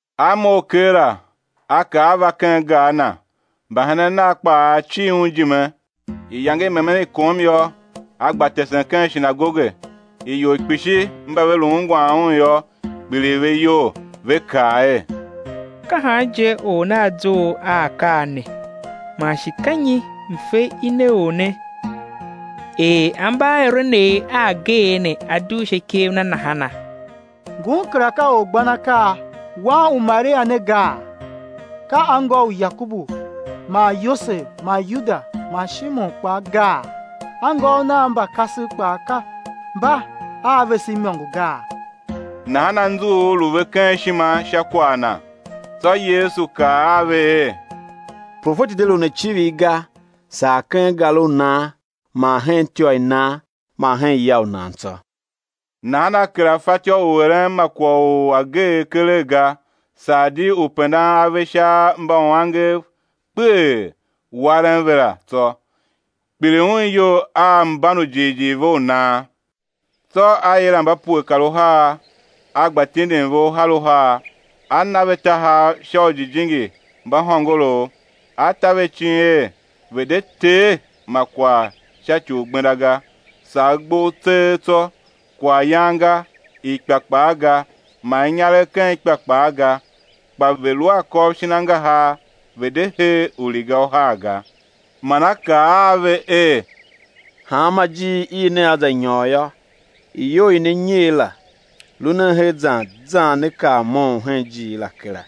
A mough keela, A kar A va ken gar na; mbahenen Nav kpaa cir Un ijime. Iyange i memen kom yô. A gba tesen ken shinagoge; ior kpishi mba ve lu ungwan Un yô, kpiligh ve iyol, ve kaa er: Ka han je Or ne A zough a akaa ne; man shi ka nyi mfe i ne Or ne, er ambaaeren a ageegh ne a dugh sha ikev Na nahana? Ngun kera ka orgbanakaa, Wan u Maria ne gaa, ka anngô u Yakobu man Yose man Yuda man Shimon kpaa gaa, anngôôv Nav mba kasev kpaa mba a vese imôngo gaa? Nahan anzughul lu ve ken ishima sha kwagh Na. Tsô Yesu kaa a ve er: Profeti de lun a icivir ga, saa ken gar u nan man hen ityô i nan man hen ya u nan tsô. Nahan A kera soo u eren ma kwagh u ageegh keregh ga, saa di u pendan ave sha mbauangev kpeghee, waren ve la, tsô. Kpiligh Un iyol a mban u jighjigh ve u nan. Tsô A yila mba pue kar uhar, A gba tindin ve uhar uhar, A na ve tahav sha ujijingi mba hôngorouv. A ta ve icin er ve̱ de tee ma kwagh sha ci u gbenda ga, saa gbough tseegh tsô; kwaghyan ga, ikpa kpaa ga, man inyaregh ken ikpa kpaa ga, kpa ve̱ lu a akôv shin angahar, ve̱ de hee uriga uhar ga. Man A kaa a ve er: Hanma ijiir i nea za nyôr yô, iyou i ne nyer la, lu nen her zan zan nea kar moughon hen ijiir la kera.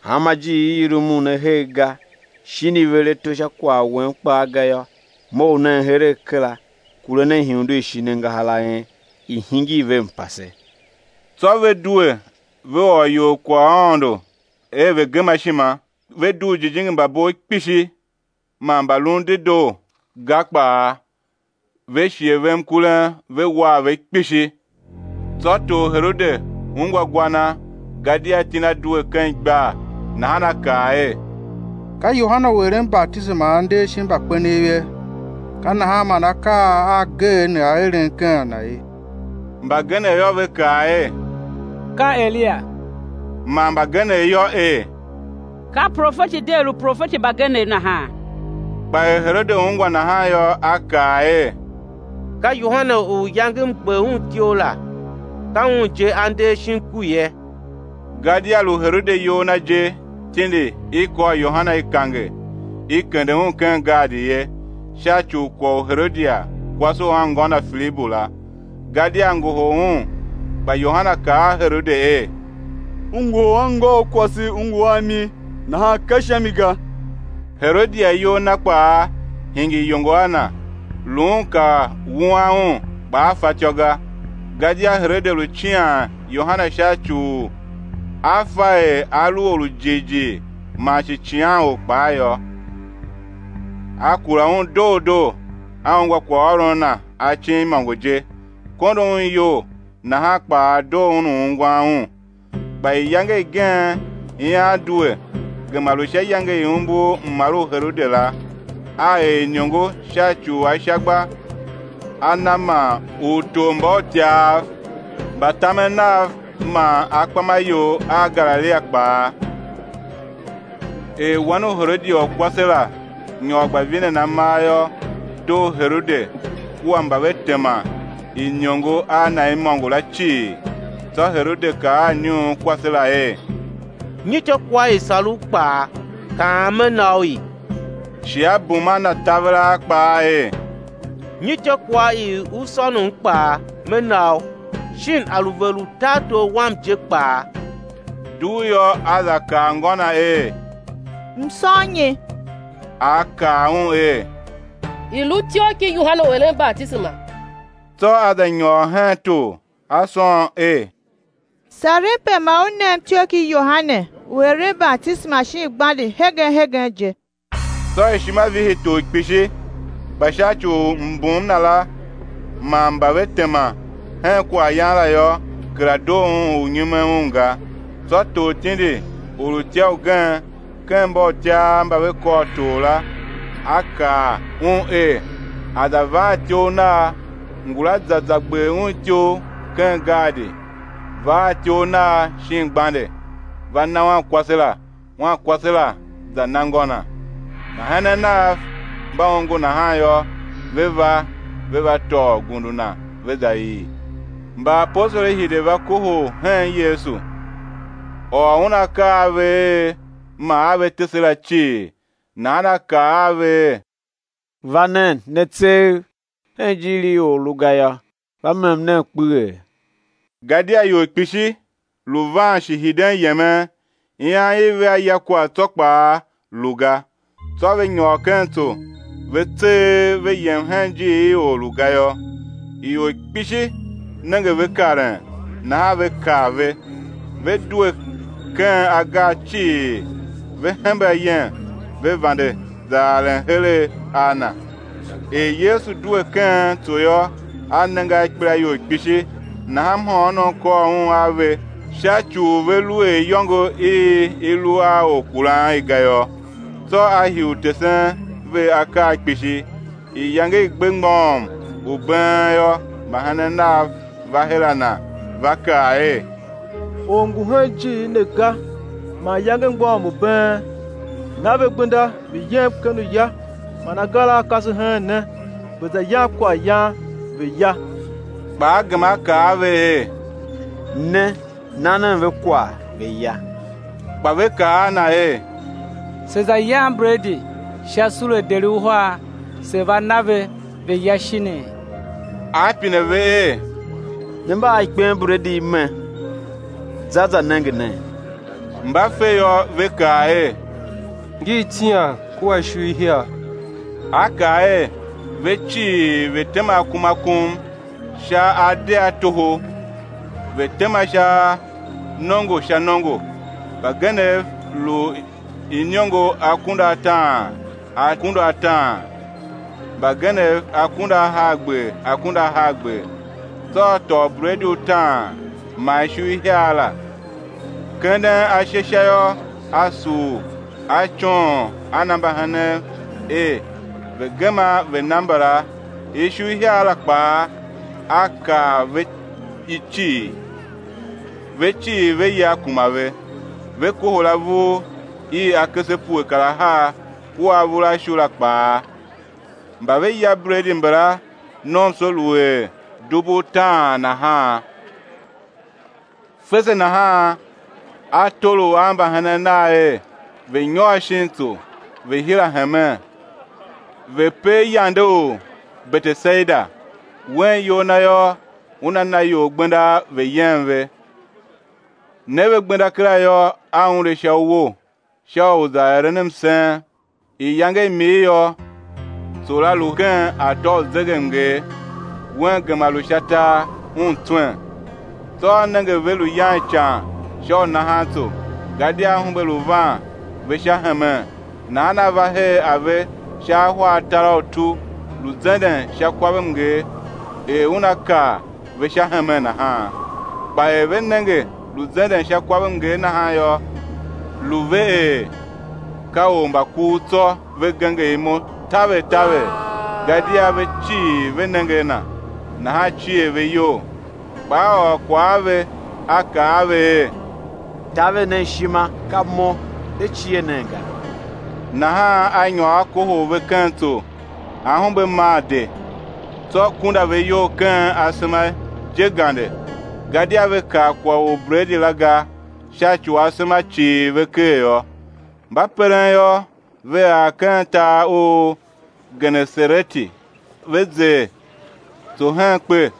Hanma ijiir i i rumun ne her ga, shin i ver ato sha kwagh wen kpaa ga yô, mough nen heregh kera, kure nen ihundu i shin angahar a en, i̱ hingir ve mpase. Tsô ve due, ve ôr ior kwaghaôndo er, ve̱ gema ishima; ve dugh ujijingi mba bov kpishi, man mbalun dedoo ga kpaa, ve shighe ve mkurem ve war ve kpishi. Tsô tor Herode ungwa gwa Na, gadia iti Na due ken igbar, nahan a kaa er: Ka Yohane u eren batisema a nder shin mbakpenev ye, ka nahan man akaa a ageegh ne a eren ken a na ye. Mbagenev yô, ve kaa er, ka Eliya; man mbagenev yô, er ka profeti di er uprofeti mbagenev nahan. Kpa er Herode ungwa nahan yô, a kaa er: Ka Yohane u iyange m gber un ityough la, ka un je a nder shin ku ye. Gadia lu Herode iyol na je tindi, i kôr Yohane, i kange, i kende un ken gaadi ye, sha ci u kwagh u Herodia kwase u anngô na Filibu la, gadia a ngohol un; kpa Yohane kaa a Herode er: U ngohol anngôu kwase u ngu a mi, nahan ka sha mi ga. Herodia iyol na kpaa hingir iyongo a na, lu un ka wuan un, kpa a fatyô ga, gadia Herode lu cian Yohane sha ci u a fa er a lu or u jighjigh man shi icighanor kpaa yô; a kura un doo doo, a ungwa kwaghôron na acin imôngo je, kondo un iyol; nahan kpaa doo un u ungwan un. Kpa iyange igen ian due, gema lu sha iyange i umbur mmar u Herode la; a er iniongo sha ci u ashagba a na man utormbautyav mba tamen nav man akpamaior a Galilia kpaa. Er wan u Herodia u kwase la nyôr gba vinen amar yô, doo Herode kua mba ve tema iniongo a na imôngo la cii, tsô Herode kaa a iniunkwase la er: Nyi ityôkwagh i i sar u kpaa, kaam, me na u i. Shi a bum a na taveraa kpaa er, nyi ityôkwagh i u sônom kpaa, me na u, shin a lu vegher u tartor wam je kpaa. Dugh yô, a za kaa ngô na er: M̱ sôn nyi? A kaa un er, i̱ lu ityough ki Yohane u eren batisema. Tsô a za nyôr hen tor, a sôn er: Sarem pe ma u nem ityough ki Yohane u eren batisema shin gbande hegen hegen je. Tsô ishima vihi tor kpishi; kpa sha ci u mbum na la, man mba ve tema hen kwaghyan la yô, kera doo un u nyumen un ga. Tsô tor tindi orutya ugen ken mbautyav mba ve kor tor la, a kaa un er, a̱ za va a ityough nagh; ngula za za gber un ityough ken gaadi, va a ityough nagh shin gbande, va na wankwase la; wankwase la za na ngô na. Mbahenen nav mba ongo nahan yô, ve va, ve va tôô gundu na, ve za ii. Mbaapostoli hide, va kohol hen Yesu, ôr Un akaa a ve er man a ve tese la cii. Nahan A kaa a ve er: Va nen, ne tseegh, hen ijiir i or lu ga yô, va mem nen kpeghee; gadia ior kpishi lu van shi hiden yemen, ian i vea ya kwagh tsô kpaa lu ga. Tsô ve nyôr ken tso, ve tseegh, ve yem hen ijiir i or lu ga yô. Ior kpishi nenge ve karen, nahan ve kav ve, ve due ken agar cii, ve hembe ayem, ve vande za aren heregh a Na. Er Yesu due ken tso yô, A nenge a ikpelaior kpishi, nahan mhôônom kôr Un a ve sha ci u ve lu er iyôngo i i lu a orkuran i ga yô. Tsô a hii u tesen ve akaa kpishi. Iyange i gbe mgbôghom u been yô, mbahenen Nav va her a Na, ve kaa er: Or ngu hen ijiir ne ga, man iyange mgbôghom u been; na ve gbenda, ve̱ yem ken uya man agar a a kase hen ne, ve̱ za yam kwaghyan, ve̱ ya. Kpa A gema A kaa a ve er: Ne, na nen ve kwagh, ve̱ ya. Kpa ve kaa a Na er: Se̱ za yam bredi sha sule deri uhar, se̱ va na ve, ve̱ ya shinii? A pine ve er: Ne mba a ikpenbredi i me? Za, za nenge nen. Mba fe yô, ve kaa er. Ngi itian kua ishu ihiar. A kaa er, ve cii, ve̱ tema akum akum sha adeghatoho. Ve tema sha nongo sha nongo, mbagenev lu iniongo akunduataan akunduataan, mbagenev akunduahargber, akunduahargber. Tsô A tôô ubredi utaan, man ishu ihiar la, kenden ashe sha yô, A sugh, A coon, a na mbahenen er ve̱ gema ve̱ na mbala. Ishu ihiar la kpaa, A kar ve i cii. Ve cii ve ya, kuma ve. Ve kohol avur, iv akese pue kar ahar, kua avur a ishu la kpaa. Mba ve ya bredi mbala, nomso lu er dubu utaan nahan. Fese nahan A tolough a mbahenen Nav er, ve̱ nyôr shin tsô, ve̱ hira hemen, ve̱ per yande u Betesaida, Wen iyol Na yô, Una na ior gbenda ve̱ yem ve. Ne ve gbenda kera yô, A unde sha uwo sha u za eren msen. Iyange i mir yô, tso la lu ken atô u zegemnger, Wen gema lu sha tar, Un tswen. Tsô A nenge ve lu yan ican sha u nahan tso, gadia ahumbe lu van ve sha hemen; nahan A va her a ve sha ahwa atar a utu, lu zenden sha kwavmnger, er Una kar ve sha hemen nahan. Kpa er ve nenge lu zenden sha kwavmnger nahan yô, lu ve er, ka ormbakuv, tsô ve genger imo taver taver; gadia ve cii ve nenge a Na, nahan cier ve iyol. Kpa A ôr kwagh a ve, A kaa a ve er: Taver nen ishima, ka Mo, de kera cie nen ga. Nahan A nyôr A kohol ve ken tso; ahumbe maa de. Tsô kunda ve iyol ken asema je gande; gadia ve kav kwagh u ubredi la ga, sha ci u asema cighir ve ker yô. Mba peren yô, ve ar ken tar u Genesareti, ve zer tso hen kpe.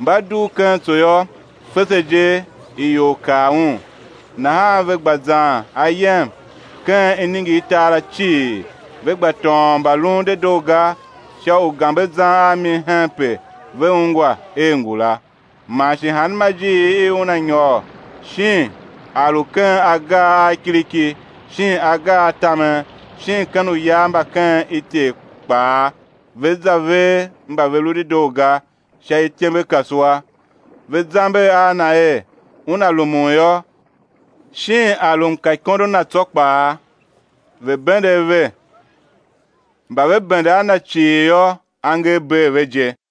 Mba dugh ken tso yô, fese je ior kav Un. Nahan ve gba zan ayem ken iningirtar la cii, ve gba tôôn mbalun dedoo ga sha ugambe zan a mi henpe ve ungwa er ngu la. Man shi hanma ijiir i Una nyôr, shin a lu ken agar a kiriki shin agar a tamen, shin ken uya mba ken ityev kpaa, ve za ver mba ve lu dedoo ga sha ityembekasua, ve zamber a Na er, Una rumun yô, shin a lu mkaikondo Na tsô kpaa, ve̱ bende ave; mba ve bende a Na cii yô, angev bee ve je.